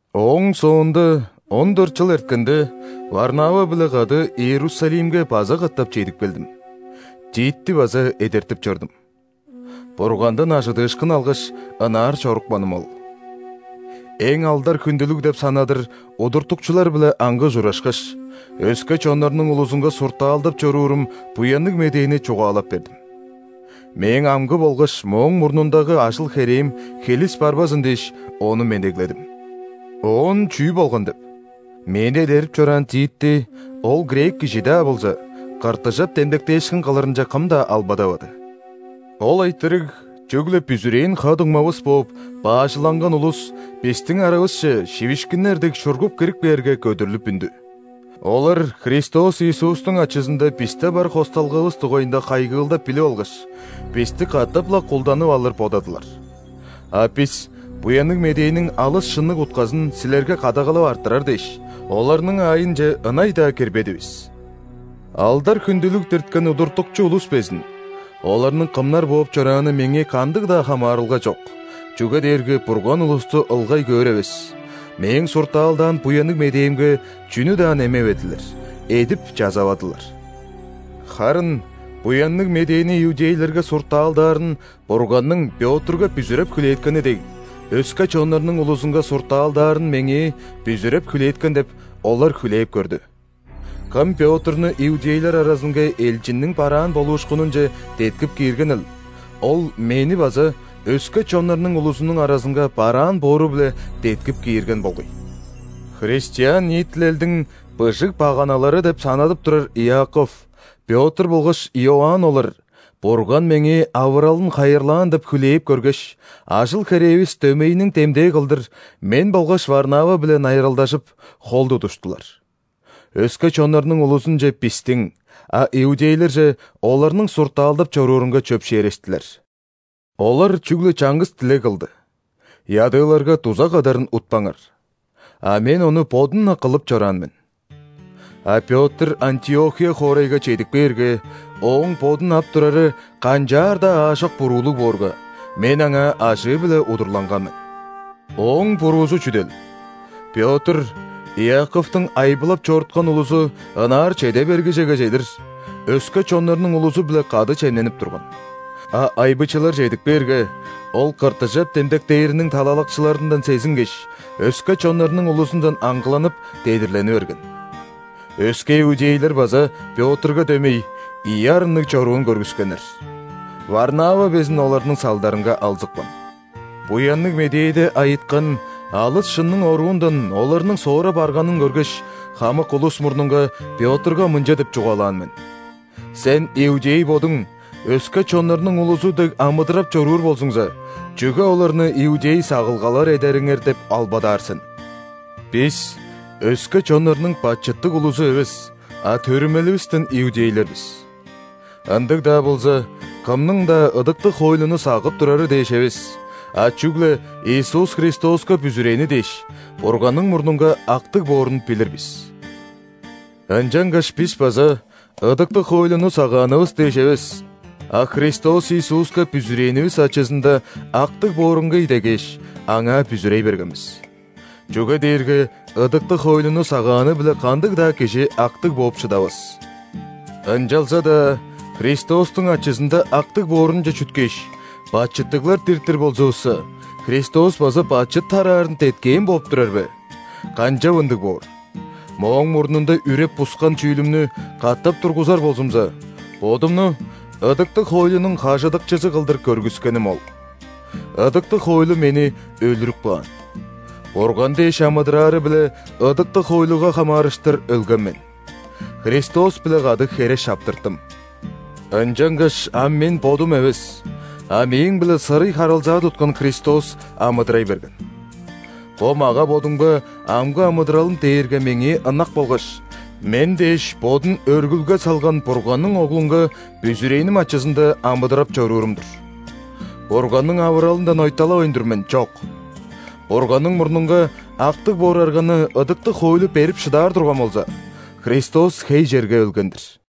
Ооң соонда, он дөрт чыл эрткенде, Варнава-биле кады Иерусалимге база катап чедип келдим. Титти база эдертип чордум. Бургандан ·ажыдыышкын алгаш, ынаар чорупканым ол. Эң алдар-хүндүлүг деп санадыр удуртукчулар-биле аңгы ужурашкаш, өске чоннарның улузунга суртаалдап чоруурум Буянныг Медээни чугаалап бердим. Мээң амгы болгаш мооң мурнундагы ажыл-херээм хилис барбазын дээш, ону медегледим. Оон чүү болган деп? Мени эдерип чораан Титти, ол грек кижи-даа болза, ·кыртыжап демдектээшкин кылырынче кым-даа албадавады. Ол айтырыг чүгле бүзүрээн ха-дуңмавыс бооп баажыланган улус бистиң аравысче, шивишкиннер дег, шургуп кирип кээрге, көдүрлүп үндү. Олар Христос Иисустуң ачызында бисте бар хосталгавыс дугайында хайгыылдап билип алгаш, бисти катап-ла кулданып алыр бодадылар. А бис Буянныг Медээниң алыс шынныг утказын силерге кадагалап арттырар дээш, оларның аайынче ынай-даа кирбедивис. Алдар-хүндүлүг дирткен удуртукчу улус безин (оларның кымнар бооп чорааны меңээ кандыг-даа хамаарылга чок, чүге дээрге Бурган улусту ылгай көөр эвес) мээң суртаалдаан Буянныг Медээмге чүнү-даа немеведилер, эдип-чазавадылар. Харын Буянныг Медээни иудейлерге суртаалдаарын Бурганның Пётрга бүзүреп хүлээткени дег, өске чоннарның улузунга суртаалдаарын меңээ бүзүреп хүлээткен деп, олар хүлээп көрдү. (Кым Пётрну иудейлер аразынга элчинниң бараан болуушкунунче деткип кииргенил, Ол мени база өске чоннарның улузунуң аразынга бараан боору-биле деткип киирген болгай.) Христиан ниитилелдиң быжыг баганалары деп санадып турар Иаков, Пётр болгаш Иоанн олар, Бурган меңээ авыралын хайырлаан деп хүлээп көргеш, ажыл-херээвис дөмейиниң демдээ кылдыр, мен болгаш Варнава-биле найыралдажып, хол тудуштулар. Өске чоннарның улузунче – бистиң, а иудейлерже – оларның суртаалдап чоруурунга чөпшээрештилер. Олар чүгле чаңгыс дилег кылды: «Ядыыларга дуза кадарын утпаңар». А мен ону бодум-на кылып чораан мен. А Пётр Антиохия хоорайга чедип кээрге, ооң бодун ап турары канчаар-даа аажок буруулуг боорга, мен аңаа ажыы-биле удурланган мен. Ооң буруузу чүдел? Пётр Иаковтуң айбылап чоруткан улузу ынаар чеде бергижеге чедир, өске чоннарның улузу-биле кады чемненип турган. А айбычылар чедип кээрге, ол ·кыртыжап демдектээриниң талалакчыларындан сезингеш, өске чоннарның улузундан аңгыланып, дедирлени берген. Өске иудейлер база, Пётрга дөмей, ийи арынныг чоруун көргүскеннер. Варнава безин оларның салдарынга алзыпкан. Буянныг Медээде айыткан алыс шынның оруундан оларның соора барганын көргеш, хамык улус мурнунга Пётрга мынча деп чугаалаан мен: «Сен, иудей бодуң, өске чоннарның улузу дег амыдырап чоруур болзуңза, чүге оларны иудей сагылгалар эдериңер деп албадаар сен? Бис – өске чоннарның бачыттыг улузу эвес, а төрүмеливистен иудейлер бис. Ындыг-даа болза, кымның-даа ыдыктыг хоойлуну сагып турары дээш эвес, а чүгле Иисус Христоска бүзүрээни дээш, Бурганның мурнунга актыг боорун билир бис. Ынчангаш бис база ыдыктыг хоойлуну сагаанывыс дээш эвес, а Христос Иисуска бүзүрээнивис ачызында актыг боорунга идегээш, Аңаа бүзүрей берген бис. Чүге дээрге ыдыктыг хоойлуну сагааны-биле кандыг-даа кижи актыг бооп шыдавас. Ынчалза-даа Христостуң ачызында актыг боорунче чүткээш, бачыттыглар диртир болзувусса, Христос база бачыт тараарын деткээн бооп турар бе? Канчап ындыг боор!» Мооң мурнунда үреп-бускан чүүлүмнү катап тургузар болзумза, бодумну ыдыктыг хоойлунуң хажыдыкчызы кылдыр көргүскеним ол. Ыдыктыг хоойлу мени «өлүрүп каан», Бурган дээш амыдыраары-биле ыдыктыг хоойлуга хамаарыштыр «өлген мен». Христос-биле кады «хере шаптырттым». Ынчангаш ам мен бодум эвес, а мээң-биле сырый харылзаа туткан Христос амыдырай берген. Бо мага-бодумга амгы амыдыралым дээрге меңээ ынак болгаш, мен дээш Бодун өргүлге салган Бурганның Оглунга бүзүрээним ачызында амыдырап чоруурум-дур. Бурганның авыралындан ойталавайн тур мен, чок! Бурганның мурнунга актыг боор арганы ыдыктыг хоойлу берип шыдаар турган болза, Христос хей черге өлген-дир!